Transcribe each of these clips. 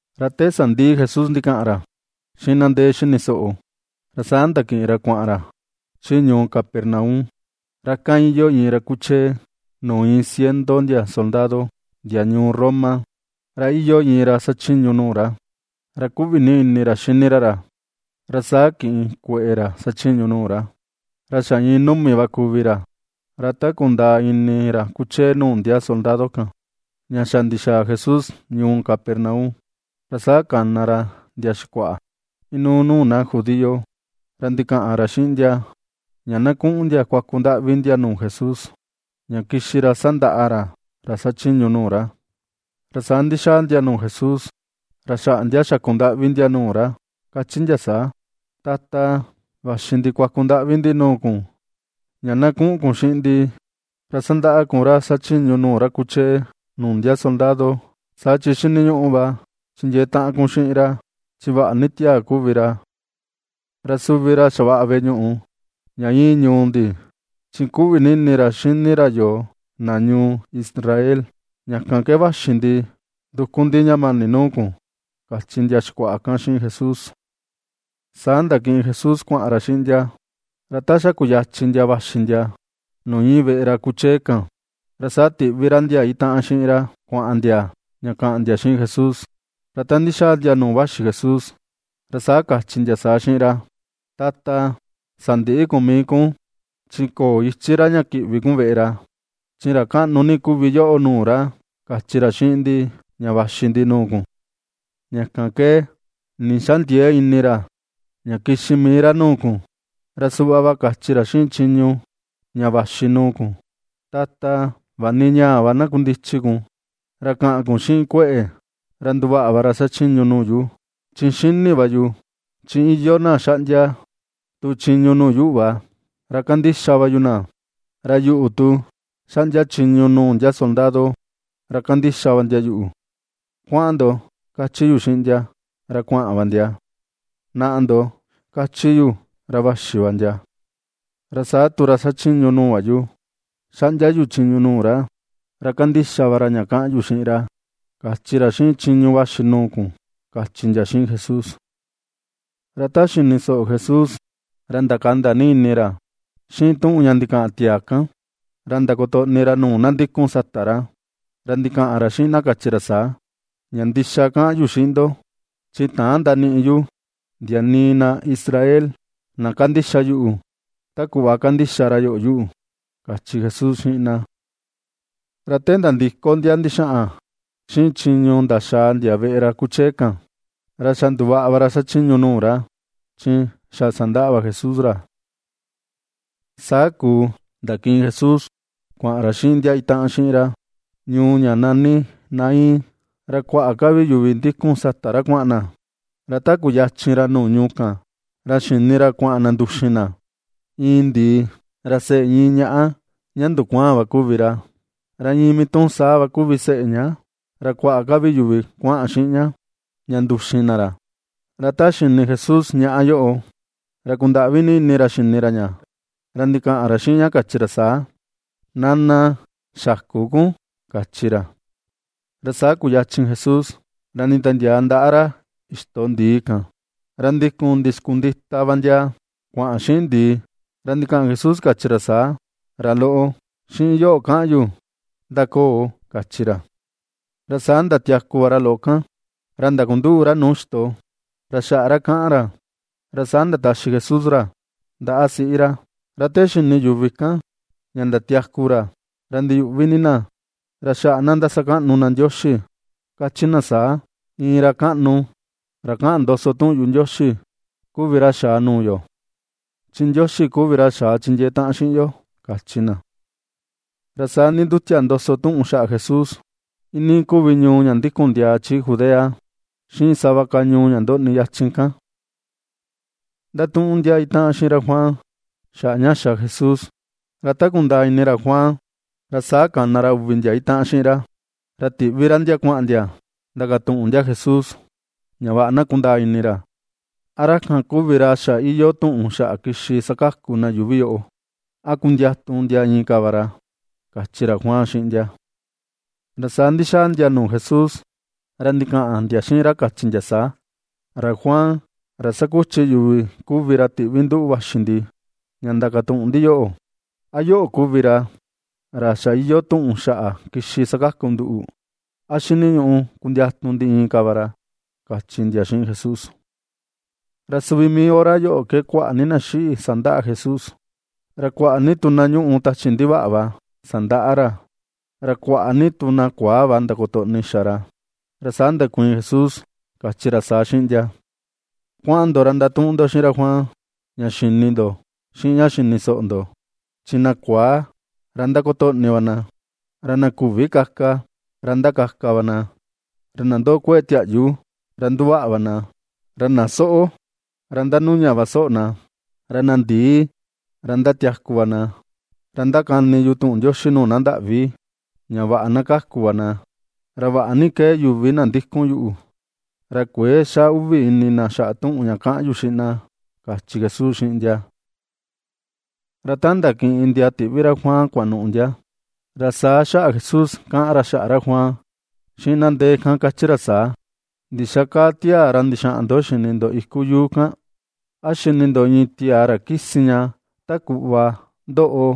Ra te sandiꞌi Jesús ndikaꞌan ra xiꞌin na ndee xini soꞌo, ra saa ndakiꞌin ra kuaꞌan ra chi ñuu Capernaum. Ra ikan iyoo iin ra kuchee nuu iin ciento ndia soldado ndia ñuu Roma. Ra iyoo iin ra xachiñu nuu ra, ra kuꞌvi ni ini ra xini ra ra, ra saa kiꞌin kueꞌe ra xachiñu nuu ra, ra xa iin numi va kuvi ra. Ra ta kundaa ini ra kuchee nuu ndia soldado kan, ña xa ndixaa Jesús ñuu Capernaum, ra saa kana ra ndia xikuaꞌa inuu nuu na judío. Ra ndikaꞌan ra xiꞌin ndia, ña na kuꞌun ndia kuaku ndaꞌvi ndia nuu Jesús, ña kixi ra sandaꞌa ra, ra xachiñu nuu ra. Ra saa ndixaa ndia nuu Jesús ra xaꞌa ndia xakundaꞌvi ndia nuu ra, kachi ndia saa: ―Tata, vaxi ndi kuaku ndaꞌvi ndi nuu kun ña na kuꞌun kun xiꞌin ndi ra sandaꞌa kun ra xachiñu nuu ra kuchee nuu ndia soldado, saa chi xiniñuꞌu va chindiee taꞌan kun xiꞌin ra chi vaꞌa ni tiaa kuvi ra. Ra suvi ra xavaꞌa veꞌe ñuꞌu ña iin ñuu ndi, chi kuꞌvi ni ini ra xini ra yoo, na ñuu Israel. Ña kan ke vaxi ndi nduku ndi ña mani nuu kun ―kachi ndia xikuaꞌa kan xiꞌin Jesús. Saa ndakiꞌin Jesús kuaꞌan ra xiꞌin ndia. Ra ta xa kuyachin ndia vaxi ndia nuu iin veꞌe ra kuchee kan, ra saa tiꞌvi ra ndia itaꞌan xiꞌin ra kuaꞌan ndia ña kaꞌan ndia xiꞌin Jesús. Ra ta ndixaa ndia nuu vaxi Jesús, ra saa kachi ndia saa xiꞌin ra: ―Tata, sandïꞌi kun mii kun, chi köo ichi ra ña kiꞌvi kun veꞌe ra, chi ra kaꞌnu ni kuvi yoꞌo nuu ra, kachi ra xiꞌin ndi ña vaxi ndi nuu kun. Ña kan ke nii ndixändiee ini ra ña kixi mii ra nuu kun. Ra suꞌva va kachi ra xiꞌin chiñu ña vaxi nuu kun: “Tata, vaꞌa ni ñaa va na kundichi kun, ra kaꞌan kun xiꞌin kueꞌe̱ ra nduvaꞌa va ra xachiñu nuu yu. Chi xini va yu, chi iyoo na xaꞌndia tu chiñu nuu yuꞌu va, ra kandixa va yu na; ra yuꞌu tu, xaꞌndia chiñu nuu ndia soldado ra kandixa va ndia yuꞌu: Kuaꞌan ndo, kachi yu xiꞌin ndia, ra kuaꞌan va ndia; Naꞌa ndo, kachi yu, ra vaxi va ndia. Ra saa tu ra xachiñu nuu va yu, xaꞌndia yu chiñu nuu ra, ra kandixa va ra ña kaꞌan yu xiꞌin ra”, kachi ra xiꞌin chiñu vaxi nuu kun ―kachi ndia xiꞌin Jesús. Ra ta xini soꞌo Jesús, ra ndakanda ni ini ra xiꞌin tuꞌun ña ndikaꞌan tiaa kan, ra ndakotoꞌni ra nuu na ndikun sata ra. Ra ndikaꞌan ra xiꞌin na, kachi ra saa: ―Ña ndixa kaꞌan yu xiꞌin ndo, chi täan ndaniꞌi yu ndia nii na Israel na kandixa yuꞌu ta kuꞌva kandixa ra yoꞌo yuꞌu ―kachi Jesús xiꞌin na. Ra te ndandiko ndia ndixaꞌan xiꞌin chiñu ndaxaa ndia veꞌe ra kuchee kan, ra xa nduvaꞌa va ra xachiñu nuu ra, chi xa sandaꞌa va Jesús ra. Saa kuu ndakiꞌin Jesús, kuaꞌan ra xiꞌin ndia itaꞌan xiꞌin ra, ñuu ña nani Naín. Ra kuaꞌa ka vi yuvi ndikun sata ra kuaꞌan na. Ra ta kuyachin ra nuu ñuu kan, ra xini ra kuaꞌan na nduxin na iin ndii, ra seꞌe iin ñaꞌa ña ndukuaan va kuvi ra. Ra iin mii tuꞌun saa va kuvi seꞌe ña. Ra kuaꞌa ka vi yuvi kuaꞌan xiꞌin ña, ña nduxin na ra. Ra ta xini Jesús ñaꞌa yoꞌo, ra kundaꞌvi ni ini ra xini ra ña, ra ndikaꞌan ra xiꞌin ña kachi ra saa: ―Nana, xäku kun ―kachi ra. Ra saa kuyachin Jesús ra nditiandiaa ndaꞌa ra ixto ndii kan. Ra ndikun ndixkundita va ndia kuaꞌan xiꞌin ndii. Ra ndikaꞌan Jesús, kachi ra saa: ―Ra loꞌo, xiꞌin yoꞌo kaꞌan yu: ¡Ndakoo! ―kachi ra. Ra saa ndatiaku va ra loꞌo kan, ra ndakunduꞌu ra nuu ixto, ra xaꞌa ra kaꞌan ra, ra saa ndataxi Jesús ra ndaꞌa siꞌi ra. Ra te xini yuvi kan ña ndatiaku ra, ra ndiyuꞌvi ni na. Ra xaꞌa na ^ndasakaꞌnu na Ndioxi, kachi na saa: ―Iin ra kaꞌnu, ra kaꞌan ndoso tuꞌun yuꞌu Ndioxi kuvi ra xaa nuu yo. Chi Ndioxi kuvi ra xaa chindiee taꞌan xiꞌin yo ―kachi na. Ra saa ndindutia ndoso tuꞌun xaꞌa Jesús, iinii kuvi ñuu ña ndikun ndiaa chi Judea xiꞌin sava ka ñuu ña ndoꞌni yachin kan. Ndatuꞌun ndia itaꞌan xiꞌin ra Juan xaꞌa ña xa Jesús, ra ta kundaa ini ra Juan, ra saa kana ra uvi ndia itaꞌan xiꞌin ra, ra tiꞌvi ra ndia kuaꞌan ndia ndakatuꞌun ndia Jesús ña vaꞌa na kundaa ini ra: a ra kan kuvi ra xa iyoo tuꞌun xa kixi sakaku na yuuvi yoꞌo, a kundiatu ndia inka va ra, kachi ra Juan xiꞌin ndia. Ra saa ndixaa ndia nuu Jesús ra ndikaꞌan ndia xiꞌin ra kachi ndia saa: ―Ra Juan, ra ^sakuchi yuvi kuvi ra tiꞌvi nduꞌu vaxi ndi ña ndakatuꞌun ndi yoꞌo: “¿A yoꞌo kuvi ra xa iyoo tuꞌun xaꞌa kixi sakaku nduꞌu? ¿A xiniñuꞌu kundiatu ndi inka va ra?” ―kachi ndia xiꞌin Jesús. Ra suvi mii hora yoꞌo ke kuaꞌa ni na xiꞌi sandaꞌa Jesús, ra kuaꞌa ni tu na ñuꞌu tachi ndivaꞌa va sandaꞌa ra, ra kuaꞌa ni tu na kuaa va ndakotoꞌni xa ra. Ra saa ndakuiin Jesús, kachi ra saa xiꞌin ndia: ―Kuaꞌan ndo ra ndatuꞌun ndo xiꞌin ra Juan ña xini ndo xiꞌin ña xini soꞌo ndo: Chi na kuaa ra ^ndakotoꞌni va na; ra na küvi kaka, ra ^ndakaka va na; ra na ndoꞌo kueꞌe̱ tiaꞌyu, ra ^nduvaꞌa va na; ra na soꞌo, ra ^ndanuña va soꞌo na; ra na ndii, ra ^ndatiaku va na. Ra ndakani yu tuꞌun Ndioxi nuu na ndaꞌvi ña vaꞌa na kaku va na. Ra vaꞌa ni ^kee yuvi na ndikun yuꞌu, ra kuëe xa uvi ini na xaꞌa tuꞌun ña kaꞌan yu xiꞌin na ―kachi Jesús xiꞌin ndia. Ra ta ndakiꞌin ndia tiꞌvi ra Juan kuanuꞌu ndia, ra saa xaꞌa Jesús kaꞌan ra xaꞌa ra Juan xiꞌin na ndee kan, kachi ra saa: ―¿Ndixa kaa tiaa ra ndixaꞌan ndo xini ndo iku yuu kan? ¿A xini ndo iin tiaa ra kisi ña, ta kuꞌva ndoꞌo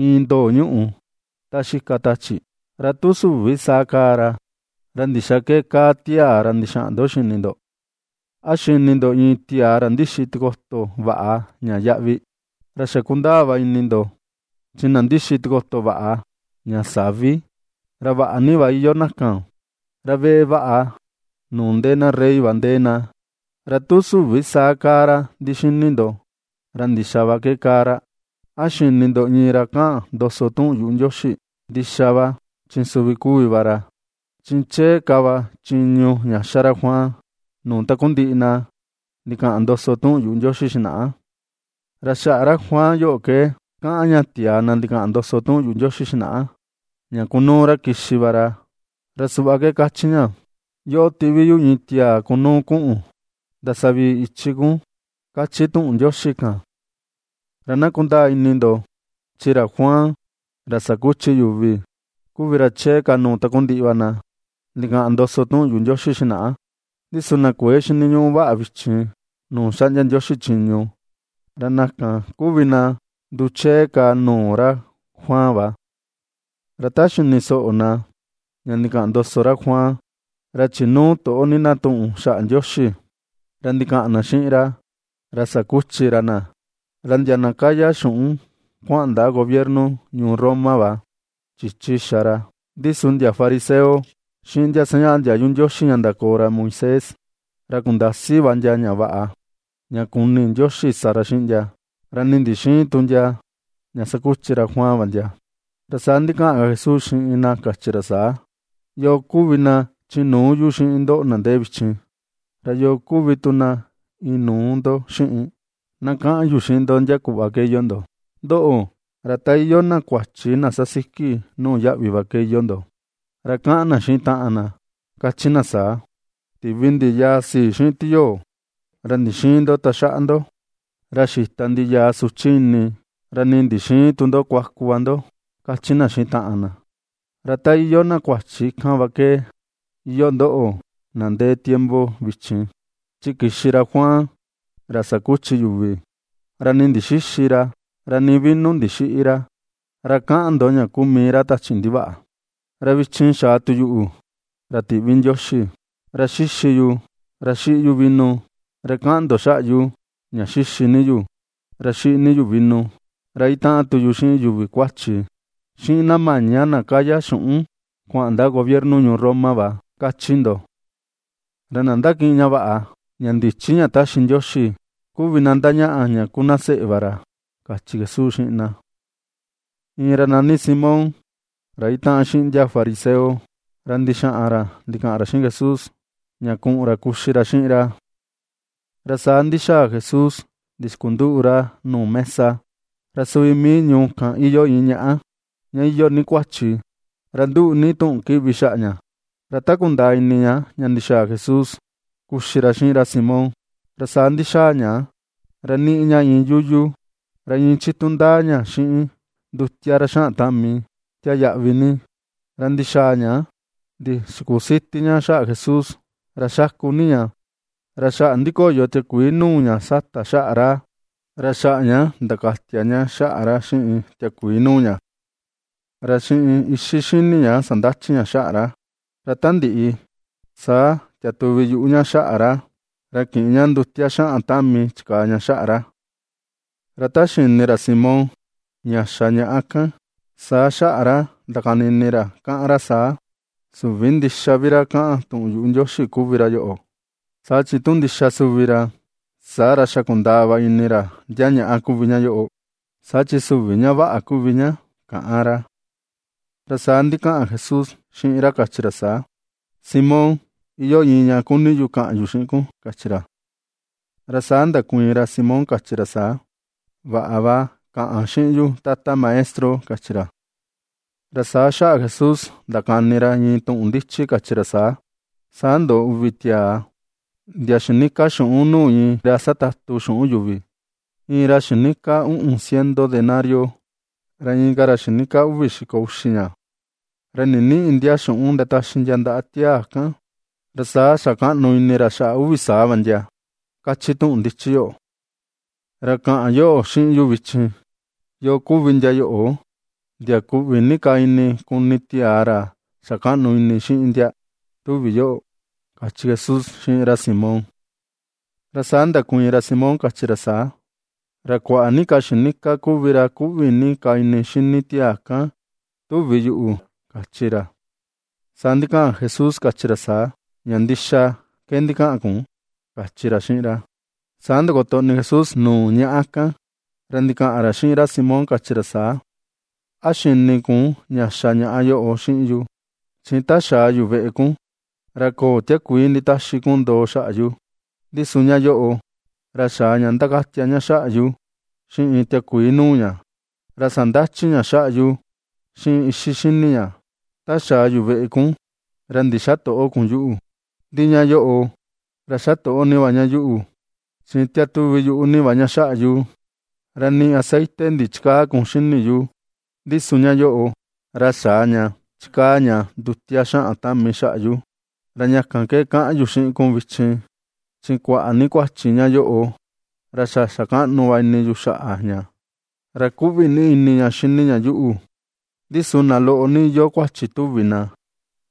iin ndoo ñuꞌu ta xika tachi? Ra tu süvi saa kaa ra, ¿ra ndixa ke kaa tiaa ra ndixaꞌan ndo xini ndo? ¿A xini ndo iin tiaa ra ndixi tikoto vaꞌa, ña yaꞌvi? Ra xa kundaa ini ndo chi na ndixi tikoto vaꞌa, ña savi, ra vaꞌa ni va iyoo na kan, ra veꞌe vaꞌa nuu ndee na Rey va ndee na. Ra tu süvi saa kaa ra ndixini ndo, ¿ra ndixa va ke kaa ra? ¿A xini ndo iin ra kaꞌan ndoso tuꞌun yuꞌu Ndioxi? Ndixa va, chi suvi kuvi va ra. Chi chee ka va chiñu ña ^xa ra Juan nuu takundiꞌi na ndikaꞌan ndoso tuꞌun yuꞌu Ndioxi xinaꞌa. Ra xaꞌa ra Juan yoꞌo ke kaꞌan ña tiaa na ndikaꞌan ndoso tuꞌun yuꞌu Ndioxi xinaꞌa, ña kunuu ra kixi va ra, ra suꞌva ke kachi ña: Yoꞌo tiꞌvi yu iin tiaa ra kunuu kuꞌun ndasavii ichi kun, kachi tuꞌun Ndioxi kan. ’Ra na kundaa ini ndo chi ra Juan ra sakuchi yuvi kuvi ra chee ka nuu takundiꞌi na ndikaꞌan ndoso tuꞌun yuꞌu Ndioxi xinaꞌa. Ndi su na kuëe xiniñuꞌu vaꞌa vichin nuu xaꞌndia Ndioxi chiñu, ra na kan kuvi na nduchee ka nuu ra Juan va. Ra ta xini soꞌo na ña ndikaꞌan ndoso ra Juan ra chinuu toꞌo ni na tuꞌun xaꞌa Ndioxi, ra ndikaꞌan na xiꞌin ra, ra sakuchi ra na, ra ndia na kaya xuꞌun kuaꞌan ndaꞌa gobierno ñuu Roma va, chichi xa ra. Ndi su ndia fariseo xiꞌin ndia sañaꞌa ndiayu Ndioxi ña ndakoo ra Moisés, ra kundasi va ndia ña vaꞌa, ña kuni Ndioxi sa ra xiꞌin ndia, ra nii ndixïin tu ndia ña sakuchi ra Juan va ndia. Ra saa ndikaꞌan ka Jesús xiꞌin na, kachi ra saa: ―¿Yoo kuvi na chinuu yu xiꞌin ndoꞌo na ndee vichin? ¿Ra yo kuvi tu na inuu ndo xiꞌin? Na kaꞌan yu xiꞌin ndo ndia kuꞌva ke iyoo ndo. Ndoꞌo, ra ta iyoo na kuachi na sasiki nuu yaꞌvi va ke iyoo ndo, ra kaꞌan na xiꞌin taꞌan na, kachi na saa: “Tivi ndi yaa sii xiꞌin tiyoo, ra ndixïin ndo taxaꞌa ndo; ra xita ndi yaa suchi ini, ra nii ndixïin tu ndo kuaku va ndo”, kachi na xiꞌin taꞌan na. Ra ta iyoo na kuachi kan va ke, iyoo ndoꞌo, na ndee tiempo vichin. Chi kixi ra Juan ra sakuchi yuvi, ra nii ndixïxi ra, ra nii vino ndixïꞌi ra, ra kaꞌan ndo ña kuu mii ra tachi ndivaꞌa. Ra vichin xaa tu yuꞌu, ra tiꞌvi Ndioxi; ra ^xixi yu, ra ^xiꞌi yu vino, ra kaꞌan ndo xaꞌa yu: ña xixi ni yu, ra xiꞌi ni yu vino, ra itaꞌan tu yu xiꞌin yuvi kuachi, xiꞌin na maña na kaya xuꞌun kuaꞌan ndaꞌa gobierno ñuu Roma va, kachi ndo. Ra na ^ndakiꞌin ña vaꞌa, ña ndichi ña taxi Ndioxi kuvi na ndañaꞌa ña ku na seꞌe va ra ―kachi Jesús xiꞌin na. Iin ra nani Simón ra itaꞌan xiꞌin ndia fariseo ra ndixaꞌan ra ndikaꞌan ra xiꞌin Jesús ña kuꞌun ra kuxi ra xiꞌin ra. Ra saa ndixaa Jesús ndixkunduꞌu ra nuu mesa. Ra suvi mii ñuu kan iyoo iin ñaꞌa, ña iyoo ni kuachi, ra nduꞌu ni tuꞌun kiꞌvi xaꞌa ña. Ra ta kundaa ini ña ña ndixaa Jesús kuxi ra xiꞌin ra Simón, ra saa ndixaa ña ra niꞌi ña iin yuyu, ra iin chitu ndaa ña xiꞌin ndutia ra xaꞌan tami, tia yaꞌvi ni. Ra ndixaa ña ndixikusiti ña xaꞌa Jesús, ra xaku ni ña, ra xaꞌa ndikoyo tiakuii nuu ña sata xaꞌa ra, ra xaꞌa ña ndakatia ña xaꞌa ra xiꞌin tiakuii nuu ña. Ra xiꞌin ixi xini ña sandachi ña xaꞌa ra. Ra ta ndiꞌi, saa tiatuvi yuꞌu ña xaꞌa ra, ra kiꞌin ña ndutia xaꞌan tami chikaa ña xaꞌa ra. Ra ta xini ra Simón ña xa ñaꞌa kan, saa xaꞌa ra ndakani ini ra, kaꞌan ra saa: “Süvi ndixa vi ra kaꞌan tuꞌun yuꞌu Ndioxi kuvi ra yoꞌo, saa chi tu ndixa suvi ra, saa ra xa kundaa va ini ra ndia ñaꞌa kuvi ña yoꞌo, saa chi süvi ña vaꞌa kuvi ña”, kaꞌan ra. Ra saa ndikaꞌan Jesús xiꞌin ra kachi ra saa: ―Simón, iyoo iin ña kuni yu kaꞌan yu xiꞌin kun ―kachi ra. Ra saa ndakuiin ra Simón, kachi ra saa: ―Vaꞌa va, kaꞌan xiꞌin yu Tata Maestro ―kachi ra. Ra saa xaꞌa Jesús ndakani ra iin tuꞌun ndichi kachi ra saa: ―Saa ndoꞌo uvi tiaa ndia xinika xuꞌun nuu iin ra satatu xuꞌun yuvi. Iin ra xinika uꞌun ciento denario, ra inka ra xinika uvi xiko uxi ña. Ra ndinïꞌi ndia xuꞌun ndataxi ndia ndaꞌa tiaa kan. Ra saa xa kaꞌnu ini ra xaꞌa uvi saa va ndia, kachi tuꞌun ndichi yoꞌo. Ra kaꞌan yoꞌo xiꞌin yu vichin: ¿Yoo kuvi ndia yoꞌo, ndia kuꞌvi ni ka ini kuni tiaa ra xa kaꞌnu ini xiꞌin ndia, tuvi yoꞌo? ―kachi Jesús xiꞌin ra Simón. Ra saa ndakuiin ra Simón, kachi ra saa: ―Ra kuaꞌa ni ka xinika kuvi ra kuꞌvi ni ka ini xini tiaa kan, tuvi yuꞌu ―kachi ra. Saa ndikaꞌan Jesús kachi ra saa: ―Ña ndixa ke ndikaꞌan kun ―kachi ra xiꞌin ra. Saa ndakotoꞌni Jesús nuu ñaꞌa kan. Ra ndikaꞌan ra xiꞌin ra Simón, kachi ra saa: ―¿A xini kun ña xa ñaꞌa yoꞌo xiꞌin yu? Chi ta xaa yu veꞌe kun, ra köo tiakuii nditaxi kun ndoo xaꞌa yu. Ndi su ña yoꞌo, ra xaa ña ndakatia ña xaꞌa yu xiꞌin tiakuii nuu ña, ra sandachi ña xaꞌa yu xiꞌin ixi xini ña. Ta xaa yu veꞌe kun, ra ndixätoꞌo kun yuꞌu. Ndi ña yoꞌo, ra xatoꞌo ni va ña yuꞌu, chi tiatuvi yuꞌu ni va ña xaꞌa yu. Ra nii aceite ndichikäa kun xini yu, ndi su ña yoꞌo, ra xaa ña chikaa ña ndutia xaꞌan tami xaꞌa yu. Ra ña kan ke kaꞌan yu xiꞌin kun vichin, chi kuaꞌa ni kuachi ña yoꞌo ra xa xa kaꞌnu va ini yu xaꞌa ña, ra kuꞌvi ni ini ña xini ña yuꞌu; ndi su na loꞌo ni iyoo kuachi tuvi na,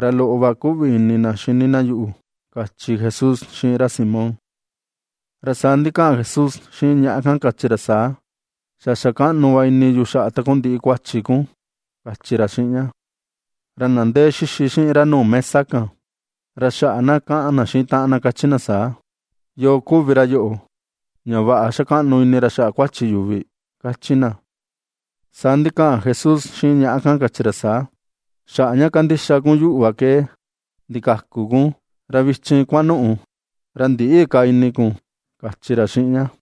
ra loꞌo va kuꞌvi ini na xini na yuꞌu ―kachi Jesús xiꞌin ra Simón. Ra saa ndikaꞌan Jesús xiꞌin ñaꞌa kan, kachi ra saa: ―Xa xa kaꞌnu va ini yu xaꞌa takundiꞌi kuachi kun ―kachi ra xiꞌin ña. Ra na ndee xixi xiꞌin ra nuu mesa kan, ra xaꞌa na kaꞌan na xiꞌin taꞌan na kachi na saa: ―¿Yoo kuvi ra yoꞌo ña vaꞌa xa kaꞌnu ini ra xaꞌa kuachi yuvi? ―kachi na. Saa ndikaꞌan Jesús xiꞌin ñaꞌa kan, kachi ra saa: ―Xaꞌa ña kandixa kun yuꞌu va ke ndikaku kun, ra vichin kuanuꞌu, ra ndïꞌi ka ini kun ―kachi ra xiꞌin ña.